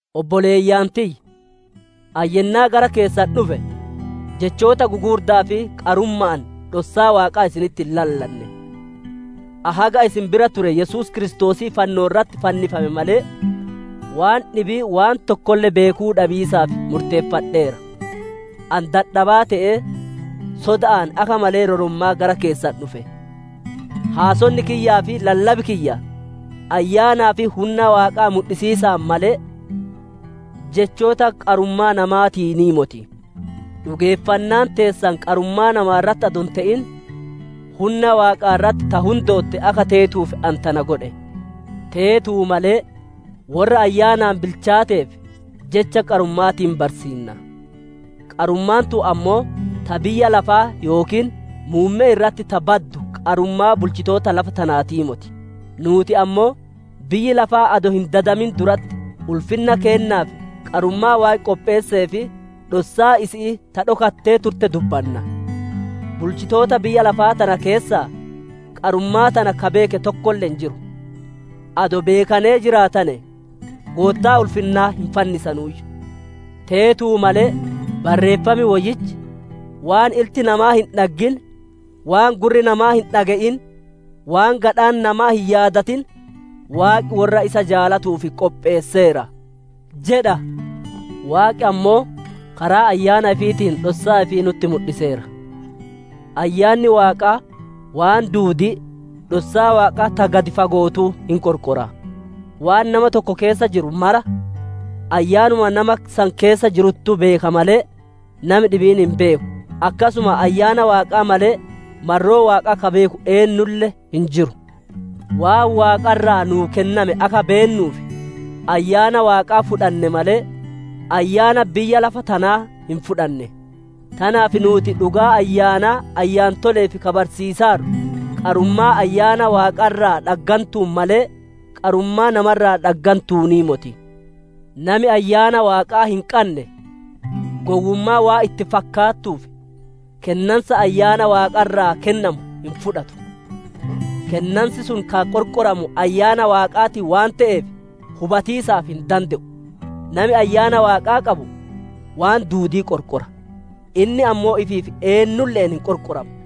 Obboleeyyan tiyya, ani yennaa gara keessan dhufe jechoota gugurda'aa fi qarumma'aan dhossaa Waaqaa isinitti hin lallanne. Ani haga isin bira ture Yesuus Kiristoosii fannoo irratti fannifame malee, waan dhibii waan tokkolle beekuu dhabiisaaf murteeffadheera. Ani dadhabaa te'ee, soda'aan akka malee rorommaa gara keessan dhufe. Haasonni kiyyaa fi lallabi kiyya ayyaanaa fi hunna Waaqaa mudhisiisaan malee, jechoota qarummaa namaatiinii moti. Dhugeeffannaan teessan qarummaa namaa irratti adoo hin te'in hunna Waaqaa irratti ta hundootte akka teetuuf ani tana godhe. Teetuu malee worra ayyaanaan bilchaateef jecha qarumma'aatiin barsiinna. Qarummaan tun ammoo ta biyya lafaa yookiin muummee irratti ta badu qarummaa bulchitoota lafa tanaatii moti. Nuuti ammoo biyyi lafaa adoo hin dadamin duratti ulfinna keennaaf qarummaa Waaqi qopheessee fi dhossaa isi'ii ta dhokattee turte dubbanna. Bulchitoota biyya lafa tana keessaa qarummaa tana ka beeke tokkolle hin jiru. Adoo beekanee jiraatane, Goottaa ulfinnaa hin fannisanuuyyu. Teetuu malee Barreeffam Woyyichi, «Waan ilti namaa hin dhaggin, Waan gurri namaa hin dhage'in, Waan gadhaan namaa hin yaadatin Waaqi worra isa jaalatanuuf qopheesseera» jedha. Waaqi ammoo karaa ayyaana ifiitiin dhossaa ifii nutti mudhiseera. Ayyaanni Waaqaa waan duudii, dhossaa Waaqaa ta gadi fago'ootuu hin qorqora. Waan nama tokko keessa jiru mara ayyaanuma nama san keessa jiruttuu beeka malee, nami dhibiin hin beeku. Akkasuma ayyaana Waaqaa malee, marroo Waaqaa ka beeku eennulle hin jiru. Waan Waaqa irraa nuu kenname akka beennuuf, Ayyaana Waaqaa fudhanne malee, ayyaana biyya lafa tanaa hin fudhanne. Tanaaf nuuti dhugaa ayyaanaa ayyaantole'eef ka barsiisaarru, qarummaa Ayyaana Waaqaa irraa dhaggantuun malee, qarummaa nama irraa dhaggantuunii moti. Nami Ayyaana Waaqaa hin qanne gowwummaa waan itti fakkaattuuf, kennansa ayyaana Waaqaa irraa kennamu hin fudhatu; kennansi sun ka qorqoramu Ayyaana Waaqaatiin waan te'eef hubatiisaaf hin dande'u. Nami Ayyaana Waaqa qabu waan duudii qorqora; inni ammoo ifiif eennulle'een hin qorqoramu.